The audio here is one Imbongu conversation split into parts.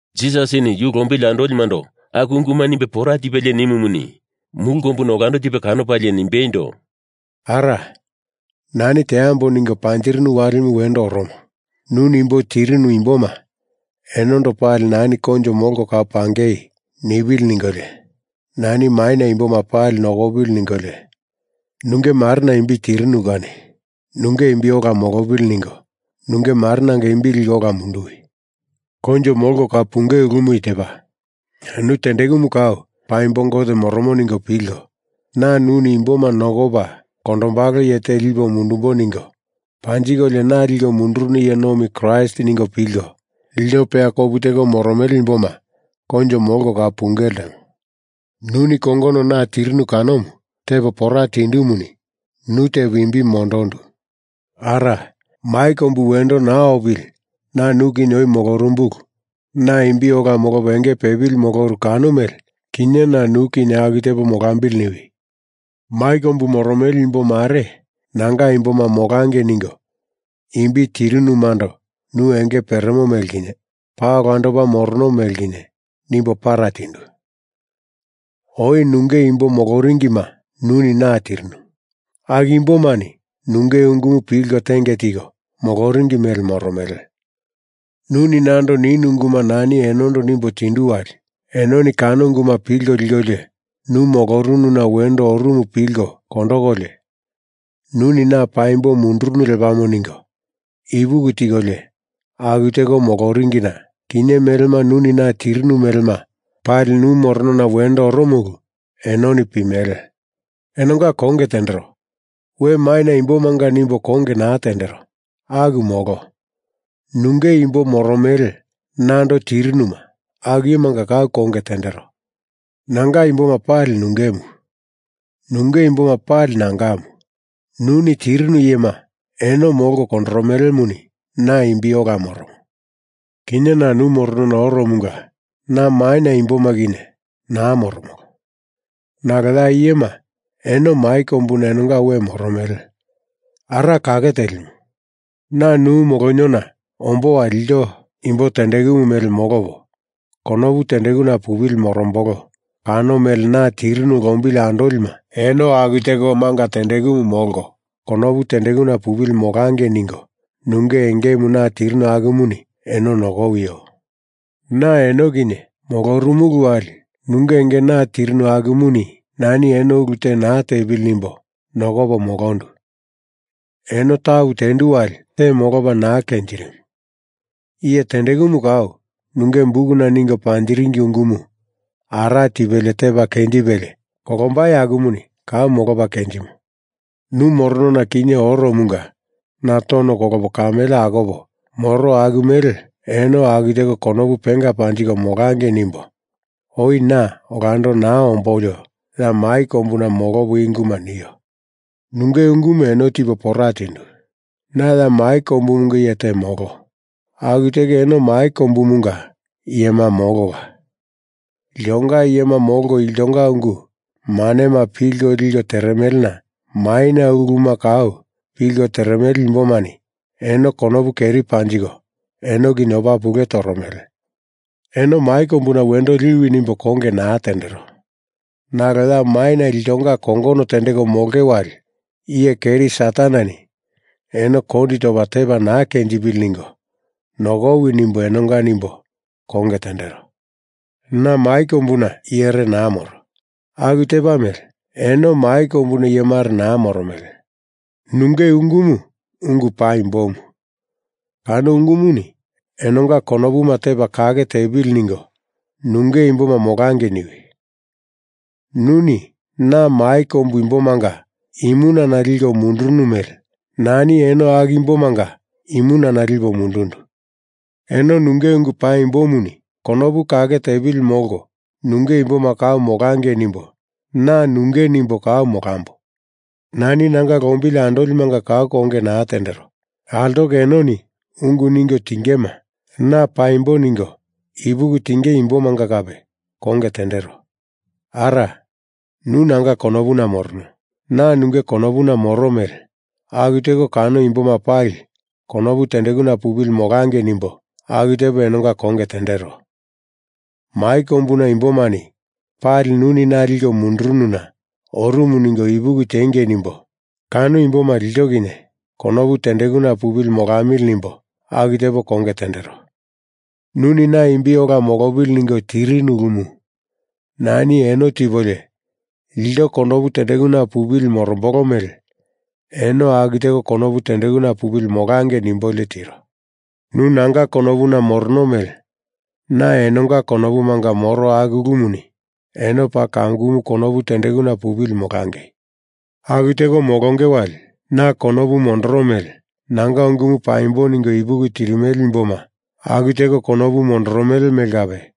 Jisasini yu lombili andolimando aku unguma nimbe pora tipelie nimumuni, mulu kombuna olando tipe kanopalie nimbeindo, “Ara, nani teambo ningo panjirinu walimu wendo oromo. Nuni imbo tirinu imboma enondo pali nani koinjo molko kau pangei nipili ningolio, nani maina imboma pali nokopili ningolio, nunge Marena imbi tirinu kani nunge imbi ola molopili ningo nunge Marenanga imbi liko ola munduwi! Koinjo molko kau punge ulumu i tepa: Nu tendekumu kau paimbo Gote morono ningo pilko, na nuni imboma nokopa kondombalo iye te lipo mundumbo ningo panjikolio na liko mundurunu iye nomi Kraist ningo pilko, ilto peya kopu teko moromele imboma koinjo molko kau punge ltemo. Nuni kongono na tirinu kanomu tepo pora tindumuni nu tepo imbi mondondu. Ara, mai kombumu wendo naa opili na nu kinye oi molorumbulu na imbi ola molopa enge pepili moloru kano mele kinye na nu kinye aku tepo molambili niwi. Mai kombu moromele imbo mare nanga imboma molangei ningo imbi tirinumando nu enge peremo mele kinye paa olandopa morono mele kinye nimbo para tindu. Oi nunge imbo moloringima, nuni na tirinu. Aku imbomani nunge ungumu pilko tenge tiko moloringi mele moromele. Nuni nando ninu unguma nani enondo nimbo tindu wali, enoni kano unguma pilko likolio nu molorununa wendo oru pilko kondokolio Nuni na paimbo mundurunu lepamo ningo ipuki tikolio aku teko moloringina kinye melema nuni na tirinu melema pali nu moronona wendo oromo ulu enoni pimele. Enonga konge tendero. We maina imbomanga nimbo konge naa tendero, aku molo. Nunge imbo moromele nando tirinuma aku iyemanga kau konge tendero. Nanga imboma pali nungemu, nunge imboma pali nangamu. Nuni tirinu iyema eno molko kondoromelemuni na imbi ola moromo. Kinye na nu moronona oromunga na maina imboma kinye naa moromolo. Nalo ya iyema eno mai kombuna enonga we moromele. Ara Kake Telimu, na nu moloniona ombo wali ilto imbo tendekumu mele molopo konopu tendekuna pupili morombolo kano mele na tirinu lombili andolima eno aku teko manga tendekumu molko konopu tendekuna pupili molangei ningo nunge engemu na tirinu akumuni eno nokowio! Na eno kinye molorumulu wali nunge enge na tirinu akumuni nani eno ulu te naa tepili nimbo nokopo molondu. Eno tapu tendu wali te molopa naa kenjirimu. Iye tendekumu kau, nunge bukuna ningo panjiringi ungumu ara tipelie tepa kenjipelie kolombai akumuni kau molopa kenjimo. Nu moronona kinye oromunga na tono kolopo kamele akopo moro aku mele eno aku teko konopu penga panjiko molangei nimbo oi na olando naa ombolio ya mai kombuna molopo i unguma nio. Nunge ungumu eno tipo pora tindu. Na ya mai kombumunga iye te molo, aku teko eno mai kombumunga iyema molola. Iltonga iyema molko iltonga ungu manema pilko liko teremelena maina uluma kau pilko teremele imbomani eno konopu keri panjiko eno kinye opa pule toromele. Eno mai kombuna wendo liwi nimbo konge naa tendero. Nalo ya maina iltonga kongono tendeko molonge wali iye keri Sataneni eno kondi topa tepa naa kenjipili ningo nokowi nimbo enonga nimbo konge tendero. Na mai kombuna iyere naa moro aku tepa mele eno mai kombuna iyemare naa moromele. Nunge ungumu ungu paimbomu. Kano ungumuni enonga konopu tepa kake tepili ningo nunge imboma molangei niwi. Nuni na mai kombu imbomanga imunana liko mundurunu mele nani eno aku imbomanga imunana lipo mundundu. Eno nunge ungu paimbomuni konopu kake tepili molko nunge imboma kau molangei nimbo na nunge nimbo kau molambo. Nani nanga lombili andolimanga kau konge naa tendero. Altoko enoni ungu ningo tingema na paimbo ningo ipuki tinge imbomanga kape konge tendero. Ara, nu nanga konopuna morono, na nunge konopuna moro mele aku teko kano imboma pali konopu tendekuna pupili molangei nimbo aku tepo enonga konge tendero. Mai kombuna imbomani pali nuni na liko mundurununa orumu ningo ipuki tiengei nimbo kano imboma ilto kinye konopu tendekuna pupili molamili nimbo aku tepo konge tendero. Nuni na imbi ola molopili ningo tirinu ulumu nani eno tipolio ilto konopu tendekuna pupili morombolo mele eno aku teko konopu tendekuna pupili molangei nimbolio tiro. Nu nanga konopuna morono mele na enonga konopumanga moro aku ulumuni eno paa kamukumu konopu tendekuna pupili molangei. Aku teko molonge wali, na konopu mondorono mele nanga ungumu paimbo ningo ipuki tirimele imboma aku teko konopu mondorono mele kape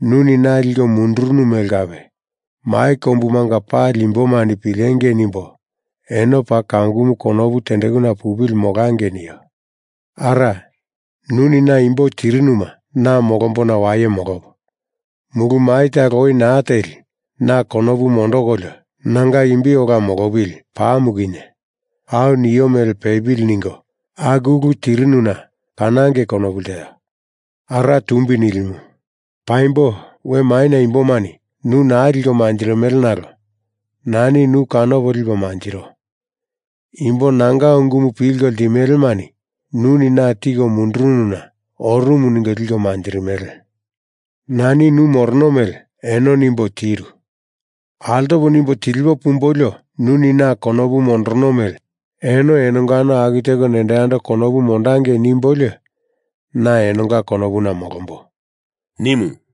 nuni na liko mundurunu mele kape, mai kombumanga pali imbomani pilengei nimbo eno paa kamukumu konopu tendekuna pupili molangei nio. Ara, nuni na imbo tirinuma na molombona waye molopo, mulu mai talo oi naa teli na konopu mondokolio nanga imbi ola molopili pamu kinye au nio mele pepili ningo aku ulu tirinuna kanangei konopu lteo. Ara Tumbi Nilimu, paimbo we maina imbomani nu naa liko manjirimele nalo nani nu kanopo lipo manjiro. Imbo nanga ungumu pilko ltimelemani nuni na tiko mundurununa orumu ningo liko manjirimele. Nani nu morono mele eno nimbo tiru. Altopo nimbo tilipo pumbolio nuni na konopu mondorono mele eno enongano aku teko nendo yando konopu mondangei nimbolio na enonga konopuna molombo,” nimu.